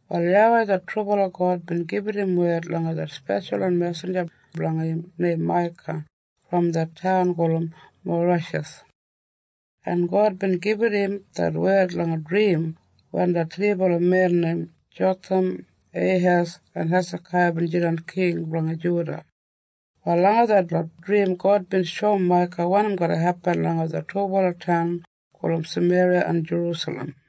Wal YAWEI det trubala God bin gibit im wed langa det speshalwan mesinja blanga im neim Maika brom det taun gulum Morasheth, en God bin gibit im det wed langa drim wen det thribala men neim Jotham, Eihes en Hesakaiya bin jidan king blanga Juda. Wal langa detlot drim God bin shoum Maika wanim garra hepin langa det dubala taun Sameriya en Jerusalem.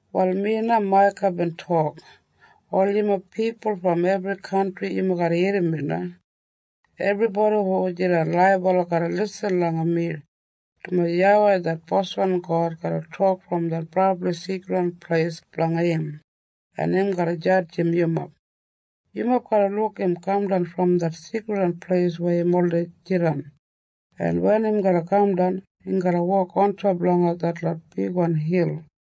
Wal mi na Maika bin tok, “Ol yumob pipul brom ebri kantri, yumob irrim mi na. Ebribodi hu jidan laibala garra lisin langa mi, dumaji YAWEI det boswan God garra tok brom det brabli seikridwan pleis blanga im, en im garra jadjim yumob. Yumob garra luk im kaman brom det seikridwan pleis weya im oldei jidan, en wen im garra kamdan, im garra wok ontop langa ol detlot bigwan hil,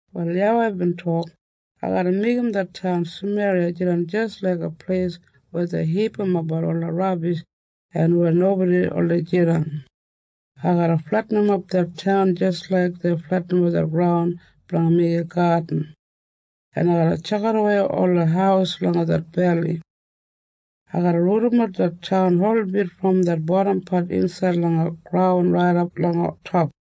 Wal YAWEI bin tok, “Ai garra meigim det taun Sameriya jidan jis laiga pleis weya dei hipimapbat ola rabish en weya nobodi oldei jidan. Ai garra fletinimap det taun jis laik dei fletinimap graun blanga meigim gadin, en ai garra tjakidawei ola haus langa det beli. Ai garra rudimat det taun holbit brom det bodampat insaid langa graun raidap langa top.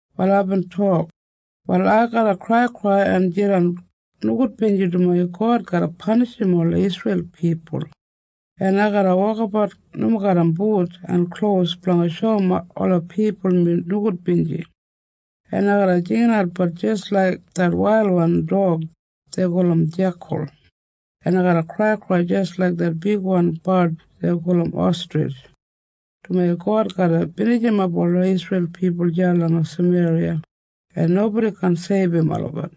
Wal aibin tok, “Wal ai garra kraikrai en jidan nogudbinji, dumaji God garra panishim ola Isreil pipul. En ai garra wokabat nomo garram but en klos blanga shoum ola pipul mi nogudbinji, en ai garra jinginatbat jis laik det wailwan dog dei gulum jekal, en ai garra kraikrai jis laik det bigwan bard dei gulum ostrij, dumaji God garra binijimap ola Isreil pipul deya langa Sameriya, en nobodi kaan seibum olabat.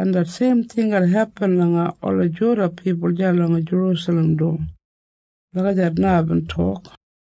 En det seim ting garra hepin langa ola Juda pipul deya langa Jerusalem du.” Lagijat na aibin tok.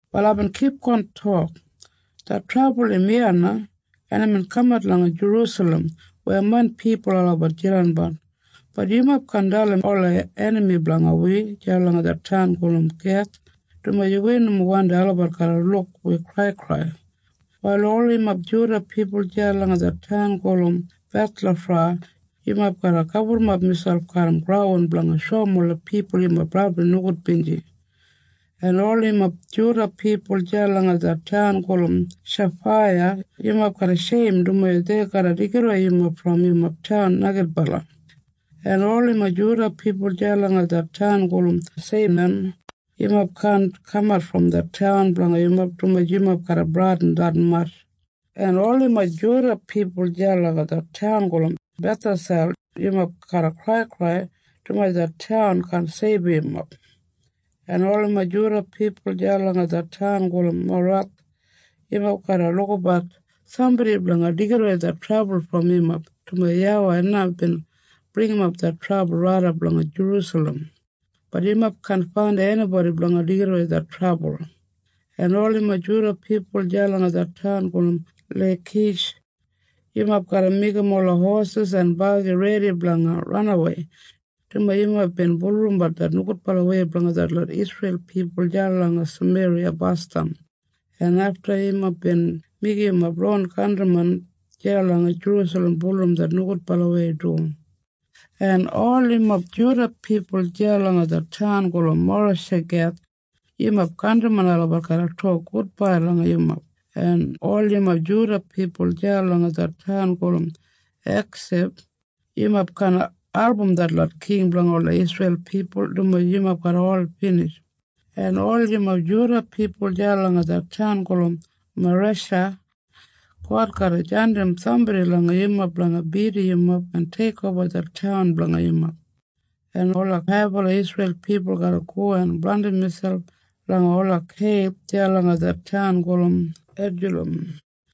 Wal aibin kipgon tok, “Det trabul im iya na, en imbin kamat langa Jerusalem weya main pipul olabat jidanbat. Bat yumob kaan dalim ola enami blanga wi deya langa det taun gulum Geth, dumaji wi nomo wandim olabat garra luk wi kraikrai. “Wal ol yumob Juda pipul deya langa det taun gulum Bethlafra, yumob garra gaburrumap miselp garram graun blanga shoum ola pipul yumob brabli nogudbinji. “En ol yumob Juda pipul deya langa det taun gulum Shafiya, yumob garra sheim, dumaji dei garra deigidawei yumob brom yumob taun neigidbala. “En ol yumob Juda pipul deya langa det taun gulum Seinan, yumob kaan kamat brom det taun blanga yumob, dumaji yumob garra bradin detmatj. “En ol yumob Juda pipul deya langa det taun gulum Bethesel, yumob garra kraikrai, dumaji det taun kaan seibum yumob. “En ol yumob Juda pipul deya langa det taun gulum Maroth, yumob garra lukabat sambodi blanga deigidawei det trabul brom yumob, dumaji YAWEI na bin bringimap det trabul raidap langa Jerusalem. Bat yumob kaan faindim enibodi blanga deigidawei det trabul. “En ol yumob Juda pipul deya langa det taun gulum Leikish, yumob garra meigim ola hosis en bagi redi blanga ranawei, dumaji yumob bin bulurrumbat det nogudbalawei blanga detlot Isreil pipul deya langa Sameriya basdam, en afta yumob bin meigim yumob ron kantrimen deya langa Jerusalem bulurrum det nogudbalawei du. “En ol yumob Juda pipul deya langa det taun gulum Morashegeth, yumob kantrimen olabat garra tok gudbai langa yumob. “En ol yumob Juda pipul deya langa det taun gulum Eksib, yumob kaan album detlot king blanga ola Isreil pipul, dumaji yumob garra ol binij. “En ol yumob Juda pipul deya langa det taun gulum Maresha, God garra jandim sambodi langa yumob blanga bidim yumob en teikoba det taun blanga yumob. En ola haibala Isreil pipul garra go en blandim miselp langa ola keib deya langa det taun gulum Edulam.